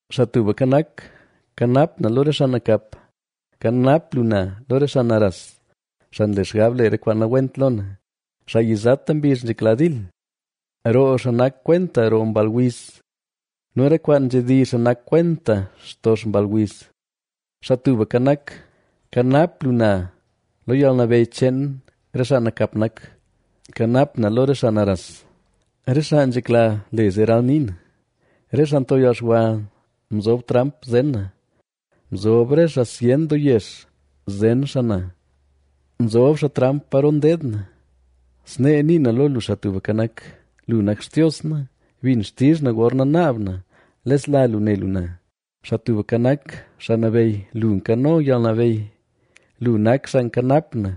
Xaa Tubka Nak, kanap na lo re xaa nakap; kanap lu na lo re xaa naras, xaa nle xgab le re kwaan nawent lo na, xaa yizata mbizh nzhekla dil. Roo xaa nak kwenta roo mball wiz; nu re kwaan nzhedizh xaa nak kwenta xtox mball wiz. Xaa Tubka Nak, kanap lu na lo yalnabeyy cheen re xaa nakap nak; kanap na lo re xaa naras, re xaa nzhekla le zee ralnii na. Re xaa nto yalxwa mzob tramp zen na; mzob re xaa zyen doo yex zen xaa na; nzob xaa tramp paro ndeed na. Snee nii na lo lu, Xaa Tubka Nak: “Lu nak Xtios na; bin xtizh na gorna naab na lesla lu ne lu na. ¡Xaa Tubka Nak, Xaa Nabeyy lu nkano yalnabeyy, lu nak xaa nkanap na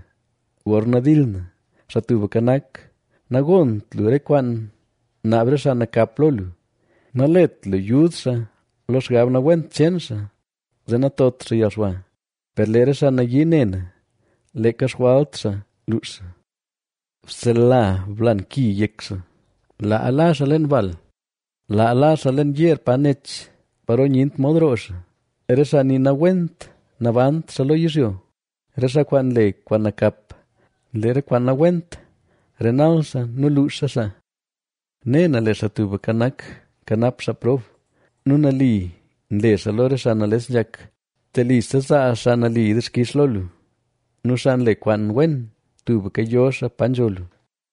gorna dil na!” Xaa Tubka Nak, nagont lu re kwaan naab re xaa nakap lo lu; nalet lu yud xaa lo xgab nawent cheen xaa, zee natot xaa yalxwa. Per lee re xaa nayii ne na, leeka xjwalt xaa luux xaa. ¡Bsela blan ki yek xaa! ¡Laa la xaa leen bal, laa la xaa leen yeer pa nech, paro nyent mod roo xaa! Re xaa nii nawent nabant xaa lo yizhyo; re xaa kwaan nle kwaan nakap, lee re kwaan nawent renal xaa nu luuxa xaa. Ne na lee Xaa Tubka Nak, nkanap xaa prob; nu nali nle xaa lo re xaa nales nzhak. Telise zaa xaa nali dixkix lo lu; nu xaa nle kwaan wen tubka yo xaa pa nzho lu.